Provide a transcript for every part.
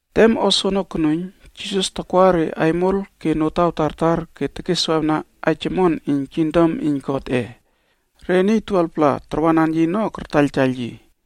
Tem o soono konuiyn, Jisas takwa re aimol ke notaw tartar ke tekeswawna aij omon iyn kingdom iyn Godꞌe. Re niy 12-pla na tarwanan yi ono kartaiyltaiyl yi.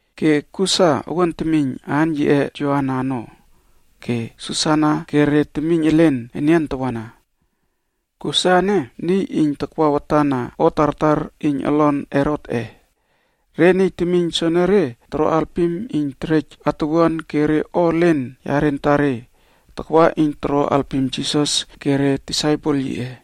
Ke Kusa owuan temiyn aan yiꞌe Joana ono, ke Susana ke re temiyn elen enian tawana. Kusa ene niy iyn takwa watan na o tartar iyn olon Herotꞌe. Re niy temiyn soenere toro alpim iyn terej atuwuan ke re o elen yare antare takwa iyn toro alpim Jisas ke re disaipel yiꞌe.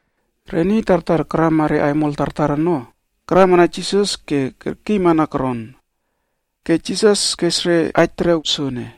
Re niy tartar karama re aimol tartar ono, karamana Jisas ke kerkiymana koron. Ke Jisas kes re aij terew soene,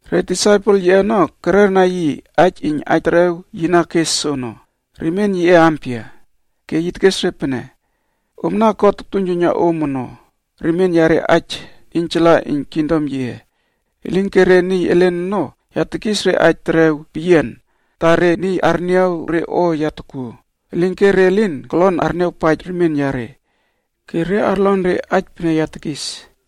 Re disaipel yiꞌe ono kererna yi aij iyn aij terew yi na kes soono, remien yiꞌe ampia? Ke yi tekes re pene, “Omna God tuiynjuiyna om ono, remien yare aij iynjala iyn kingdom yiꞌe. Elinke re niy elen ono ya tekis re aij terew peyiana ta ‘Re niy arniaw re o ya takuo, elinke re lin kolon arniawpaij remien yare. Ke re arlon re aij pene ya tekis,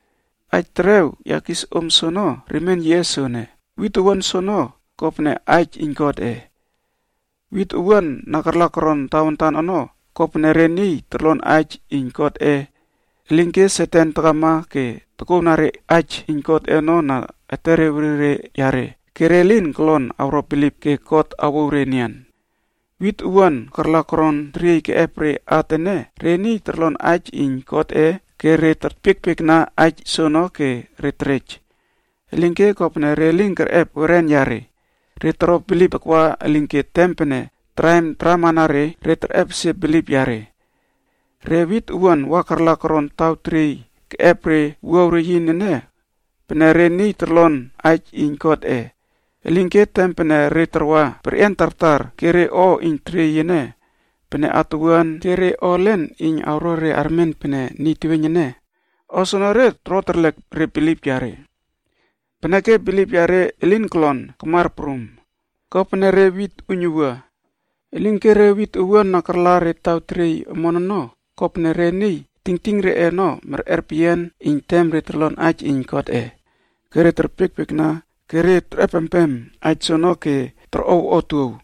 “Aij terew ya kis om soono, remien yiꞌe soene, wit owuan soono, kopene aij iyn Godꞌe. Wit owuan na karla koron tawantan ono ko pene re niy torlon aij iyn Godꞌe, elinke Satan takama ke tokouwna re aij iyn Godꞌe ono na etere werire yare ke re lin kolon awro bilip ke God awouw re enian. Wit owuan karla koron teriey keꞌep at ene re niy torlon aij iyn Godꞌe ke re terpiekpiekna aij soono ke re terej. Elinke kopene re lin kerꞌep weren yare, re toro bilip takwa elinke tem pene re o kokelek taramana re ke toko re terꞌepesie bilip yare. Re wit owuan wa karla koron taw teriey keꞌep re wuaw reyin ene pene re niy torlon aij iyn Godꞌe, elinke tem pene re tarwa, perꞌian tartar ke re o iyn teriey ene pene atuwuan ke re o elen iyn awro re armen pene niy teweiyn ene, o soenere toro terlek re bilip yare. Peneke bilip yare elin kolon kamar prum, kopene re wit uiynuwua. Elinke, re wit owuan na karla taw teriey omon ono kopene re niy tingting reꞌe ono merꞌer peyian iyn tem re torlon aij iyn Godꞌe ke re terpiekpiekna ke re terꞌepempem aij soono ke torꞌow otuow.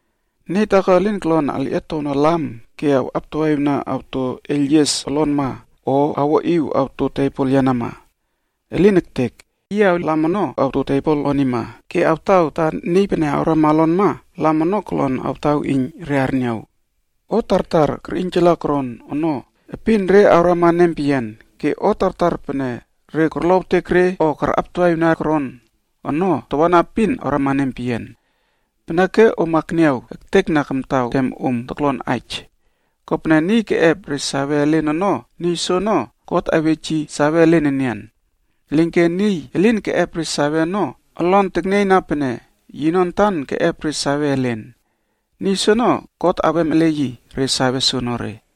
“Niy taako elin kolon alꞌietowna lam ke awꞌaptawaꞌiwna awto eiylyies olonma o awoꞌiw awto bet yenama. Elin ektek! Yi awle lam ono awto tebol onima ke awtaw ta niy pene awrama olonma, lam ono kolon awtaw iyn re arniaw. O tartar kerꞌiynjala koron ono epin re awrama nempeyian, ke o tartar pene re korlowtek re o karꞌaptawaꞌiwna koron ono tawana epin awrama nempeyian. Peneke om akniaw ektekna kamtaw tem om toklon aij, kopene niy keꞌep re save elen ono, niy soono God awej yi save elen enian. Elinke niy elin keꞌep re save ono olon teknieyna pene yino antan keꞌep re save elen. Niy soono God awem ele yi re save soonore.”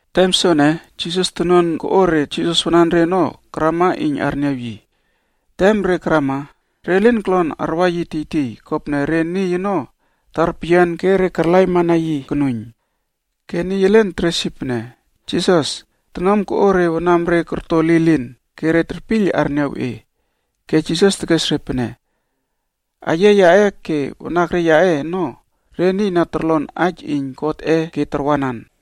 Tem soene Jisas tonuan koꞌo re Jisas wananre ono karama iyn arniaw yi. Tem re karama, re lin kolon arwa yi tiytiy kopene re niy ono tar peyian ke karlaimana yi konuiyn. Ke niy elen teres yi pene, “Jisas, tonuam koꞌo re wanamre korto lilin ke re terpiyl arniaw e.” Ke Jisas tekes re pene, “Aiyia yaꞌe ke wanakre yaꞌe ono re niy na torlon aij iyn Godꞌe ke tarwanan.”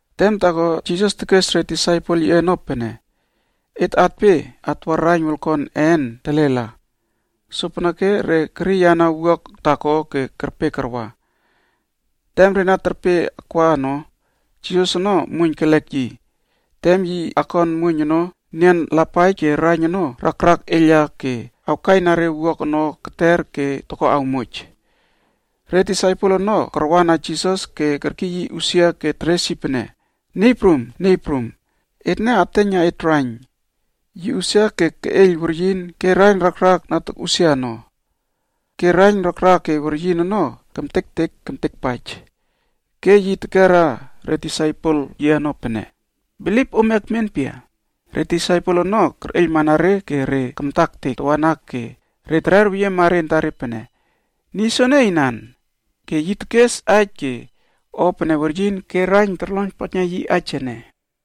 Tem taako Jisas tekes re disaipel yiꞌe ono pene, “Et atpe atwa raiyn wolkon een telela.” Sopeneke re keriyana pinas taako ke kerpe karwa. Tem re na terpe akwa ono, Jisas ono muoiyn kelek yi. Tem yi akon muoiyn ono, nian lapaij ke raiyn ono rakrak eiyla ke awkaina re pinas ono keter ke toko awmoj. Re disaipel ono karwa na Jisas ke kerkiy yi usia ke teres yi pene, “Niy prum, niy prum, etne ateiyna et raiyn ke atmat!” Yi usia ke keꞌeiyl weryin ke raiyn rakrak na tokꞌusia ono. Ke raiyn rakrak ke weryin ono kemtektek kemtekpaij. Ke yi tekera re disaipel yiꞌe ono pene, “Bilip ome ekmen pia?” Re disaipel ono kerꞌeiylmana re ke re kamta ektek tawana ke re terer weyiema re antare pene, “Ene niy ampia ene, ke weryin ke rakrak ono na korlonpaijna yi aij ene?”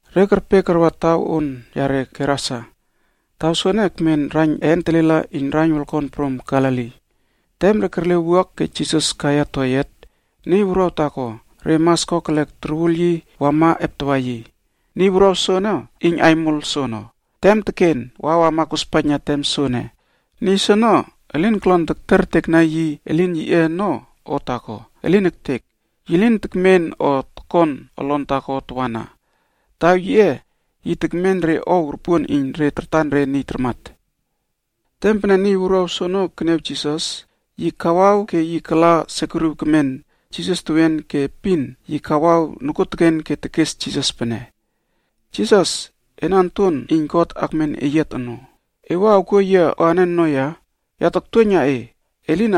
Re kerpe karwa taw on yare Gerasa. Taw soene ekmen raiyn een telela iyn raiyn wolkon prum Galili. Tem re kerle wuak ke Jisas kaiya toyiat, niy wuruaw taako re mas kokelek torwul yi wama eptawa yi. Niy wuruaw soono iyn aimol soono. Tem teken wa wama kospaijna tem soene, niy soono elin kolon tektertekna yi elin yiꞌe ono o taako, elin ektek! Yi lin tekmen o tokon olon taako tawana. Taw yiꞌe, yi tekmen re ow ropuon iyn re tartan re niy tarmat. Tem pene niy wuruaw soono keniaw Jisas, yi kawaw ke yi kala sekuriw kemen Jisas tewien ke epin yi kawaw nokuoteken ke tekes Jisas pene, “Jisas, ena Onton Wuruaw iyn God Akmen Eyiat Ono, e wua awkuo yia o anen ono ya? Ya taktuoiyna e, e lin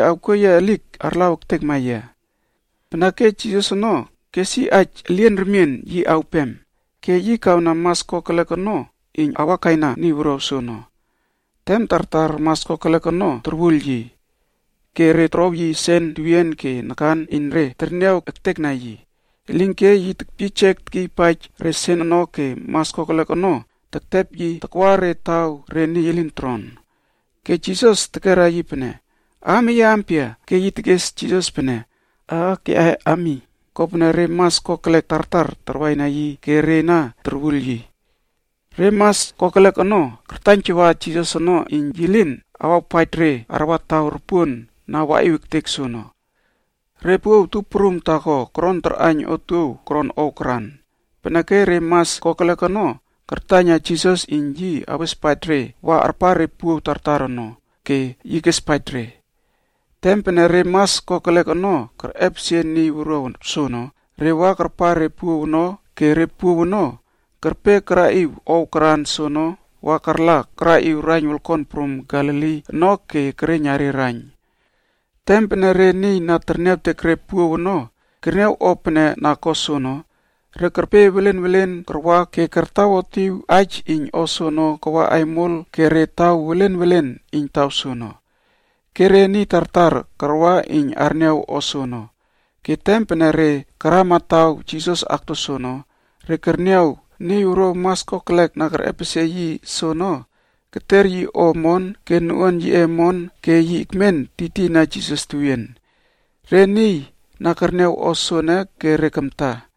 awkuoekliek ektekma yia.” Peneke Jisas ono kes aij elien remien yi awpem ke yi kawna mas kokelek ono iyn awa kaina niy wuruaw soono. Tem tartar mas kokelek ono torwul yi. Ke re torow yi sen opon nakan iyn re terniaw ektekna yi. Elinke yi tekyiyjek tekyiypaij re sen ono ke mas kokelek ono tektepkur tektepaij yi takwa re taw re niy elin toron ono. Ke Jisas tekera yi pene, “Aam eye ampia?” Ke yi tekes Jisas pene, “Aak yaꞌe Ami.” Kopene re mas kokelek tartar tarwaina yi ke re na torwul yi. Re mas kokelek ono kartaiynjawa Jisas ono iyn yi lin awawpaij re arwa taw ropuon na waꞌiw ektek soono. Re puow tup prum taako koron tarꞌaiyn otuow koron ow karan. Peneke re mas kokelek ono kartaiynjawa Jisas ono iyn yi awespaij re wa arpar re puow tartar ono, ke yi kespaij re. Tem pene re mas kokelek ono kerꞌepesie niy wuruaw soono, re wa karpar re puow ono ke re puow ono kerpe karaꞌiw ow karan soono wa karla karaꞌiwna raiyn wolkon prum Galili ono ke kereiyna re raiyn ke karmat. Tem pene re niy na terniawtek re puow ono kerniaw o pene na ko soono, re kerpe welen welen karwa ke kartawotꞌiw aij iyn o soono kawa aimol ke re taw welen welen iyn taw soono. Ke re temiynwuruaw tartar karwa iyn arniaw o soono. Ke tem pene re karama taw Jisas akto soono, re kerniaw niy wuruaw mas kokelek na kerꞌepesie yi soono keter yi o omon ke noꞌuan yiꞌe omon ke yi meniw ekmen tiytiyna Jisas tewien. Re niy na kerniaw o soene kamta.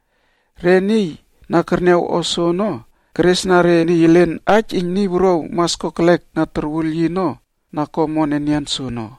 Re niy na kerniaw o soono keresna re niy elen aij iyn niy wuruaw mas kokelek na karwaina yi ono na ko omon enian soono.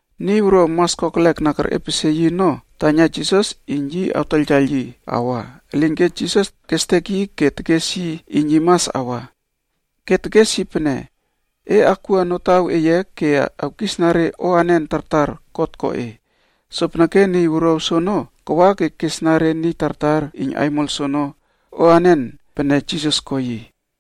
Niy wuruaw mas kokelek na kerꞌepesie yi ono taiyna Jisas iyn yi awtaiyltaiyl yi awa, elinke Jisas kestek yi ke tekes yi iyn yi mas awa. Ke tekes yi pene, “E akwua olon eye ke awkisna re o anen tartar God ko e.” Sopeneke niy wuruaw soono kawa ke kesna re niy tartar iyn aimol soono o anen pene Jisas ko yi.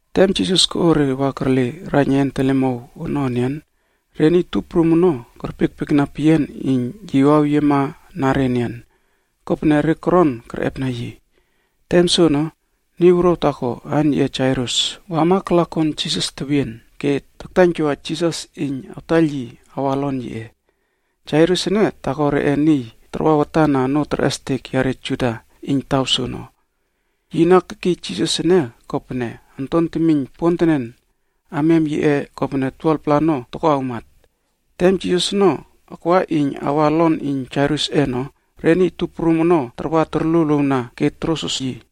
Tem Jisas koꞌo re wa kerle raiyn een telemow ono enian, re niy tup prum ono kerpiekpiekna peyian iyn yi waweyiema na re enian, kopene re koron kerꞌepna yi. Tem soono, niy wuruaw taako aan yiꞌe Jairus wama kala kon Jisas tewien ke taktaiynjawa Jisas iyn awtaiyl yi awa olon yiꞌe. Jairus ene taako reꞌe niy tarwa watan na onoo terꞌestek yare Juda iyn taw soono. Yi na kekiy Jisas ene kopene onton temiyn pontenen amiam yiꞌe kopene 12-pla ono toko awmat. Tem Jisas ono akwa iyn awa olon iyn Jairusꞌe ono re niy tup prum ono tarwa torluowluowna ke torosros yi.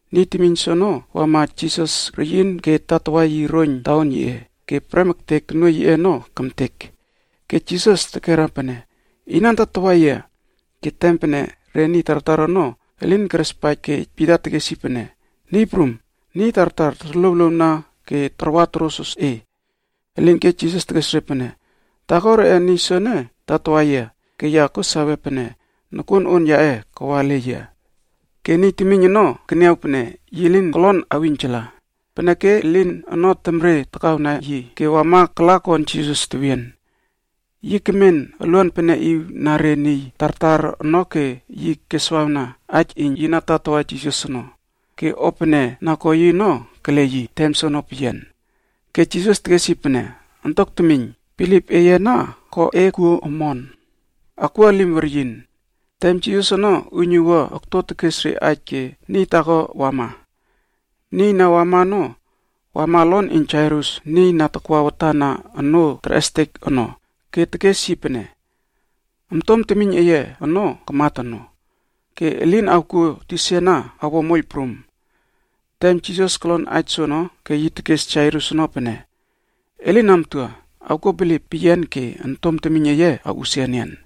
Niy temiyn soono wama Jisas reyin ke tatawa yi roiyn taon yiꞌe ke prem ektek tonuoiy yiꞌe ono kemtek. Ke Jisas tekera pene, “Inan tatawa yia?” Ke tem pene re niy tartar ono elin kerespaij ke Pita tekes yi pene, “Niy prum, niy tartar torluowluowna ke tarwa torosros e.” Elinke Jisas tekes re pene, “Taako reꞌe niy soene tatawa yia ke ya kuo sawe pene nokuon on yaꞌe kawa ele yia.” Ke niy temiyn ono keniaw pene yi lin kolon awꞌiynjala, peneke elin ono temre takawna yi ke wama kala kon Jisas tewien. Yi kemen uluan peneꞌiw na re niy tartar ono ke yi keswawna, aij iyn yi na tatawa Jisas ono, ke o pene na ko yi ono kele yi tem soono peyian. Ke Jisas tekes yi pene, “Ontok temiyn, bilip eye ana ko e kuo omon. Akwua elim weryin.” Tem Jisas ono uiynuwua okto tekes re aij ke niy taako wama. Niy na wama ono, wama olon iyn Jairus niy na takwa watan na onoo terꞌestek ono, ke tekes yi pene, “Ontom temiyn eye ono kamat ono, ke e lin awkuo tisa ana awo moiyl prum.” Tem Jisas kolon aij soono ke yi tekes Jairus ono pene, “E lin amtua, awkuo bilip peyian ke ontom temiyn eye awo omon ke yi awꞌusia enian.”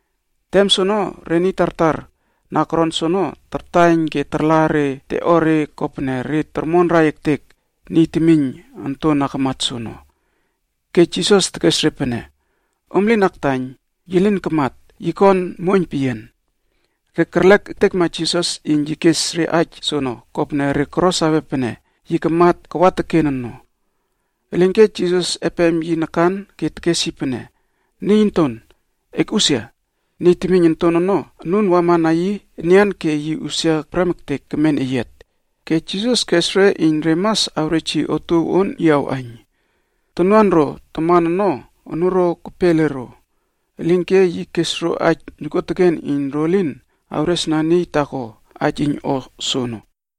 Tem soono re niy tartar na koron soono tartaiyn ke tarla re teꞌore kopene re tormonrai ektek niy temiyn onton na kamat soono. Ke Jisas tekes re pene, “Om lin aktaiyn, yi lin kamat, yi kon muoiyn peyian.” Re kerlek ektekma Jisas iyn yi kes re aij soono kopene re koro sawe pene yi kamat kawa teken no. Elinke Jisas epem yi nakan ke tekes yi pene, “Niy onton, ekꞌusia!” Niy temiyn onton ono anun wama na yi enian ke yi usia prem ektek kemen eyiat. Ke Jisas kes re iyn re mas awrej yi otuow on yi awꞌaiyn. Tonuan ro taman ono anuro kepe ele ro, elinke yi kes ro aij nokuoteken iyn ro lin awresna niy taako aij iyn o soono.